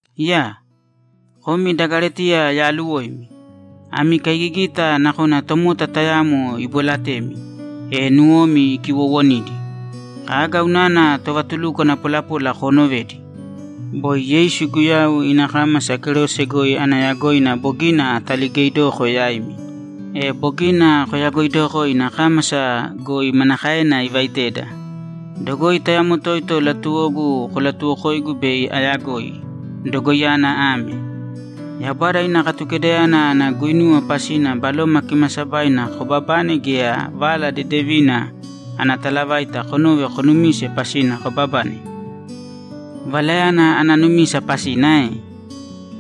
Iyaa! Komi da Galetiya yaaluwoimi! Ami kaigigita nakona tomota tayamo ibolatemi, e nuwomi ikiwowonidi! Kaga unana tovatulukwana polapola koonovedi? Boi Yeisu Guyau ina kámasa kerose goi ana yagoina bogina ataligeidoko yaimi, e bogina koyagoidoko ina kámasa goi manakaena ivaiteda. Dogoi tayamo toito latuwogu kolatuwokoigu bei ayagoi. Dogoiyana ame: Yaubada ina Katukedayana ana guinuwa pasina Baloma Kimaasabaina kobabane, gea Vala Dedevina ana talavaita konove konumise pasina kobabane? Valayana ana numisa pasina ae?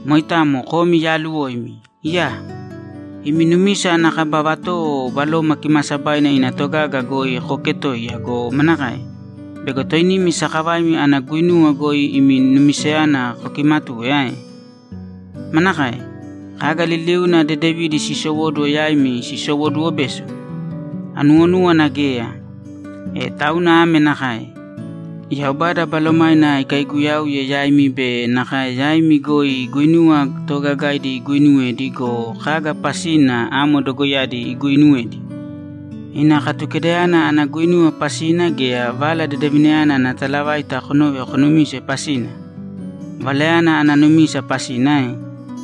Moitamo komi yaaluwoimi! Iyaa! Imi numisa ana kaba vatowo Baloma Kimaasabaina ina togaga goi kooketoiya go, manakae? Bego toinimi sakavaimi ana guinuwa goi imi numisayana kokimatuwe ae? Manakae? Kaga liliuna dedevidi siisowóduwo yaimi sisowoduwo beso? Anuwonúwana geya. E tauna ame nakae: Yaubada Balomaina ikaiguyauye yaimi be nakae yaimi goi guinuwa toogagaidi iguuinuwedi go, kaga pasina amo dogoiyadi iguuinuwedi? Ina Katukedayana ana guinuwa pasina gea Vala Dedevinayana ana talavaita konove konumise pasina? Valayana ana numisa pasina ae?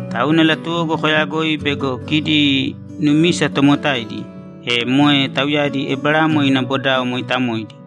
Tauna latuwogu koyagoi bego kidi numisa tomotaidi, e moe tauyadi Eberamo ina bodao mooitamoidi.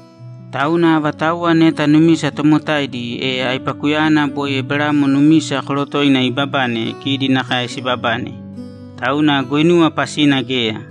Tauna avatauwa neta numisa tomotaidi, e aipakuyana boi Eberamo numisa korotoina iibabane kidi nakae sibabane. Tauna guinuwa pasina geya.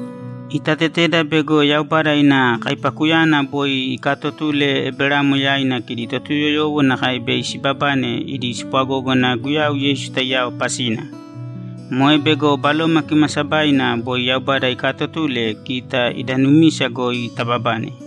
Itateteda bego Yaubada ina kaipakuyana boi ikaatotule Eberamo yaina kidi Totuyoyowo nakae bei sibabane idi spwagógana Guyau Yeisu taiyao pasina. Moe bego Baloma Kimaasabaina boi Yaubada ikaatotule kita ida numisa goi tababane.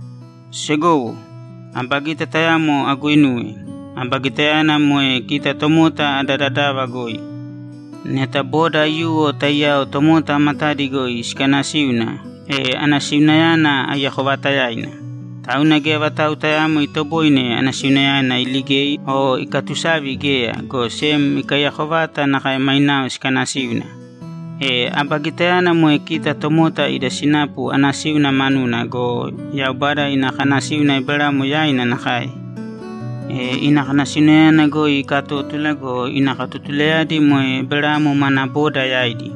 Segowo, aba gita tayamo aguinuwe. Aba gitayana moe kita tomota ada dadava goi. Neta boda aiyuwo taiyao tomota matadi goi sikanasíuna, e anasiunayana aiyako vaatayaina, tauna geya vatau tayaamo itoboine anasiunayana iligei o ikatusavi geya, go sem ikaiyako vata nakae mainao sikanasíuna. E aba gitayana moe kita tomota ida sinapu anasíuna manuna go, Yaubada ina kanasíuna Eberamo yaina nakae. E ina kanasiunayana goi ikatótula go, ina katotulayadi moe Eberamo mana boda yaidi.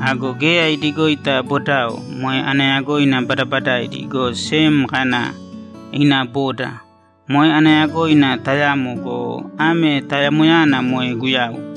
Ago geya idigoita bodao; moe ana yagoina badabadaidi, go sem kana, ‘Ina boda.’ Moe ana yagoina tayamo go, ame tayamoyana moe Guyau.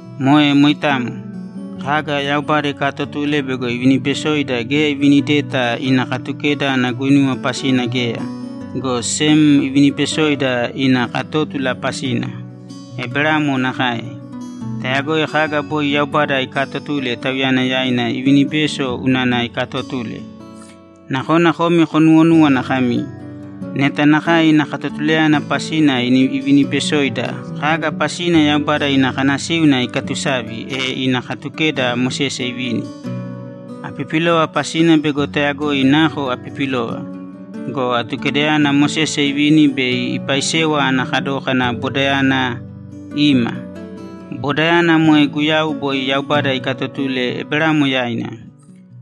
Moe moitamo. Kaga Yaubada ikaatotule bego ivinibesoida geya ivinideta ina Katukeda ana guinuwa pasina geya, go sem ivinibesoida ina katótula pasina. Eberamo nakae. Tayagoi kaga boi Yaubada ikaatotule tauyana yaina ivinibeso unana ikatotule. Nakona komi konuwonúwana kami, ‘Neta nakae ina katotulayana pasina ivinibesoida, kaga pasina Yaubada ina kanasíuna ikatusavi, e ina Katukeda Mosese ivini?’ Apipilova pasina bego tayagoi nako apipilova. Go Atukedayana Mosese ivini bei ipaisewa ana kadókana bodayana ima. Bodayana moe Guyau boi Yaubada ikatotule Eberamo yaina.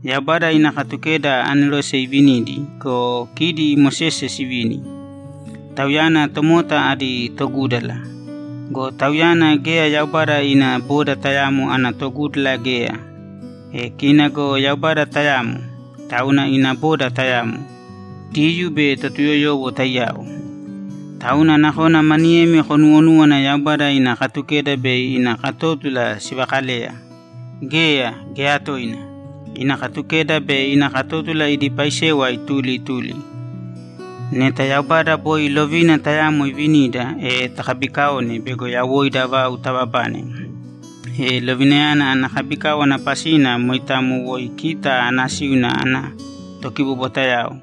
Yaubada ina Katukeda anerose ivinidi go, kidi Mosese sivini; tauyana tomota adi togúdala. Go tauyana geya Yaubada ina boda tayamo ana togúdala geya. E kina go Yaubada tayamo, tauna ina boda tayamo, Diyuu be Totuyoyowo taiyao. Tauna nakona maniyemi konuwonúwana Yaubada ina Katukeda be ina katótula sivakaleya. Geya, geya toina! Ina Katukeda be ina katótula idi paisewa ituli ituli. Neta Yaubada boi lovina tayamo ivinida, e takabikaone bego yawoida vau tababane, e lovinayana ana kabikáwana pasina moitamo woi kita anasíuna ana tokibobwatayao.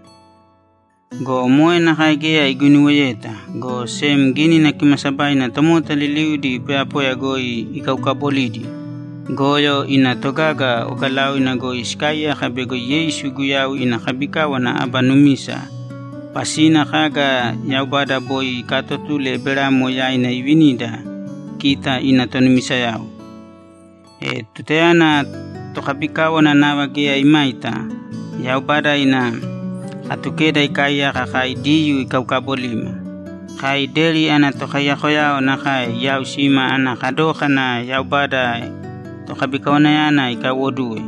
Go moe nakae geya iguinuweyeta, go sem Gínina Kimaasabaina tomota liliudi poyapoya goi ikaukabolidi, goyo ina togaga ogalaoina goi sikaaiyaka bego Yeisu Guyau ina kabikáwana aba numisa pasina kaga Yaubada boi ikaatotule Eberamo yaina ivinida kita ina tonumisayao. E tutayana tokabikáwana nava geya imaita, Yaubada ina Katukeda ikaaiyaka kai Diyuu ikaukabolima; kai deri ana tokaiyakayao nakae iyaausima ana kadókana Yaubada tokabikawanayana ikaiwoduwe.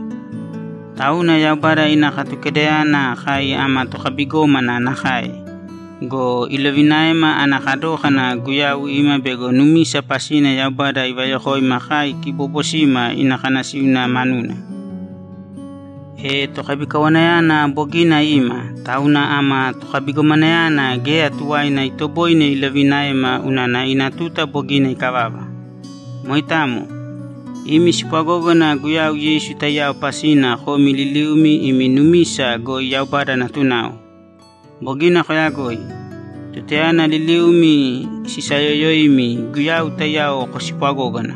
Tauna Yaubada ina Katukedayana kai ama tokabigómana nakae go, ilovinaema ana kadókana Guyau ima bego numisa pasina Yaubada ivayokoima kai kiboobosima ina kanasíuna manuna. E Tokabikawanayana bogina ima, tauna ama tokabigomanayana geya tuwaina itoboine ilovinaema unana ina tuta bogina ikavava. Moitamo. Imi spwagógana Guyau Yeisu taiyao pasina komi liliumi imi numisa goi Yaubada natunao. Bogina koyagoi. Tutayana liliumi sisayoyoimi, Guyau taiyao kospwagógana,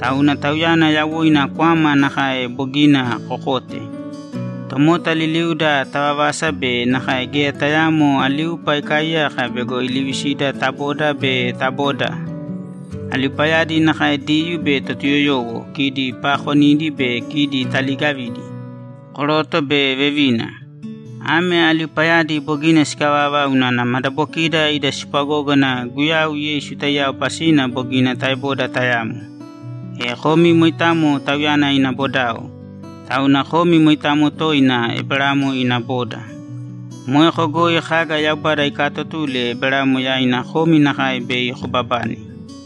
tauna Tauyana yawoina kwama nakae bogina kokote. Tomota liliuda tavavasa be nakae geya tayaamo aliupa ikaaiyaka bego ilivisida ta boda be ta boda. Aliupayadi nakae Diyuu be Totuyoyowo, kidi paakonidi be kidi taliigavidi, koroto be vevina. Ame aliupayadi bogina sikavava unana madabokida ida spwagógana Guyau Yeisu taiyao pasina bogina taeboda tayamo. E komi moitamo Tauyana ina bodao, tauna komi moitamo toina Eberamo ina boda. Moeko goi kaga Yaubada ikaatotule Eberamo yaina komi nakae bei kobabane.